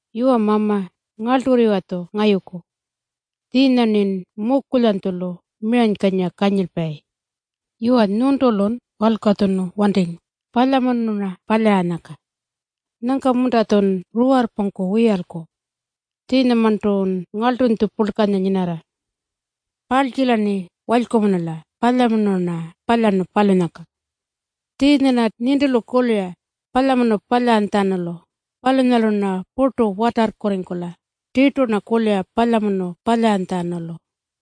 Yuwa Mama, ngarlturriwa-tju ngayuku. Tjiinya-rnin mukulyanytjulu miranykanyira kanyilpayi. Yuwa, nyuntulun walkatjunu wantingu palyamunu-rna palyaranyangka. Nyangka-munta-tjun ruwarrpungku wiyalku? Tjiinyamarntun ngarltunytju purlkanya nyinarra. Parltjila-rni walykumunula palyamunu-rna palyarnu palunyangka. Tjiinya-rna nintilu kulira palyamunu palyantjatjanulu. Palunyalu-rna purtu watarrkurringkula. Tirtu-rna kulira palyamunu palyantjatjanulu.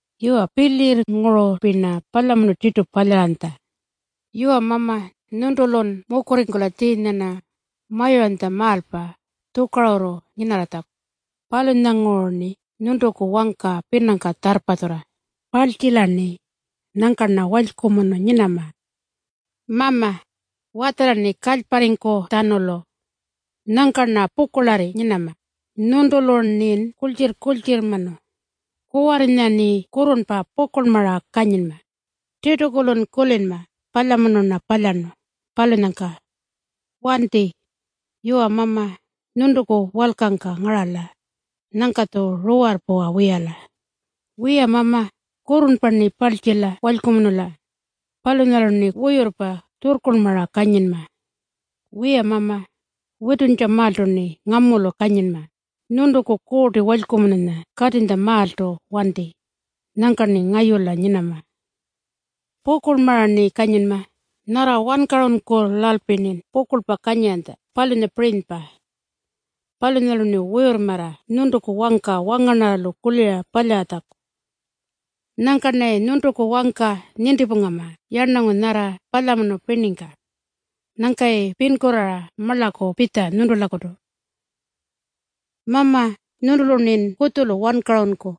Yuwa, pilyirrngurulpi-rna palyamunu tirtu palyaranytja. Yuwa Mama, nyuntulun mukurringkula tjiinya-rna mayuranytjamaalpa tjukarurru nyinarratjaku. Palunyanguru-rni nyuntuku wangka pinangka tjarrpatjurra. Parltjila-rni. Nyangka-rna walykumunu nyinama. Mama, watjala-rni kalyparringkutjatjanulu. Nyangka-rna pukurlarri nyinama. Nyuntulu-rnin kurltjirr-kurltjirrmanu. Kuwarrinya-rni kurrurnpa pukurlmara kanyinma. Tirtu-kurlun kulinma palyamunu-rna palyarnu palunyangka. Wanti. Yuwa Mama, nyuntuku walkangka ngarala. Nyangka-tju ruwarrpuwa wiyala. Wiya Mama, kurrurnpa-rni parltjila walykumunula. Palunyalu-rni wuyurrpa tjurrkurlmara kanyinma. Wiya Mama, wituntjamaaltu-rni ngamulu kanyinma. Nyuntuku Kuurti Walykumununya katinytjamaaltu wanti. Nyangka-rni ngayula nyinama. Pukurlmara-rni kanyinma, nyarra wankarunkulalpi-rnin pukurlpa kanyiranytja, palunyapirinypa. Palunyalu-rni wuyurrmarra nyuntuku wangka wangarnarralu kulira palyaratjaku. Nyangka-rnayi nyuntuku wangka nintipungama yarnangu nyarra palyamunu pirningka. Nyangka-yayi pinkurraara marlaku pitja nyuntulakutu. Mama, nyuntulu-rnin kutjulu wankarunku.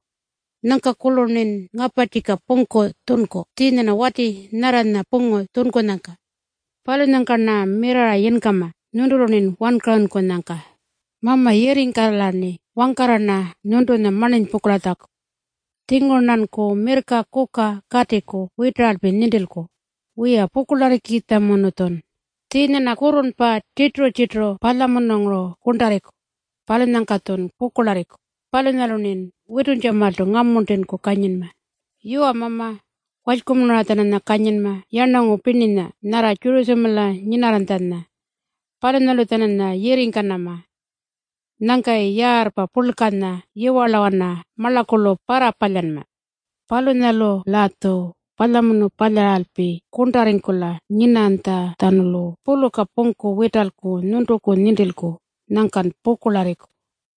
Nyangka-kurlu-rnin ngaparrtjika pungku tjunku tjiinya-rna wati nyarranya pungu tjunkunyangka. Palunyangka-rna mirrarra yinkama nyuntulu-rnin wankarunkunyangka. Mama, yirringkala-rni wangkarra-rna nyuntunya marninypungkulatjaku. Tjinguru-rnanku mirrka kuka katiku witaralpi nintilku. Wiya, pukurlarrikitjamunu-tjun. Tjiinya-rna kurrurnpa tjirturu-tjirturu palyamununguru kurntarringku, palunyangka-tjun pukurlarriku. Palunyalu-rnin wituntjamaaltu ngamuntinku kanyinma. Yuwa Mama, walykumunura-tjananya kanyinma yarnangu pirninya nyarra Tjurutjamala nyinarranytjanya. Palunyalu-tjananya yirringkanama. Nyangka-yayi yaarrpa purlkanya yiwarlawana marlakulu parrapalyanma. Palunyalu-latju palyamunu palyaralpi kurntarringkula nyinanytjatjanulu puluka pungku witalku nyuntuku nintilku. Nyangkan pukurlarriku.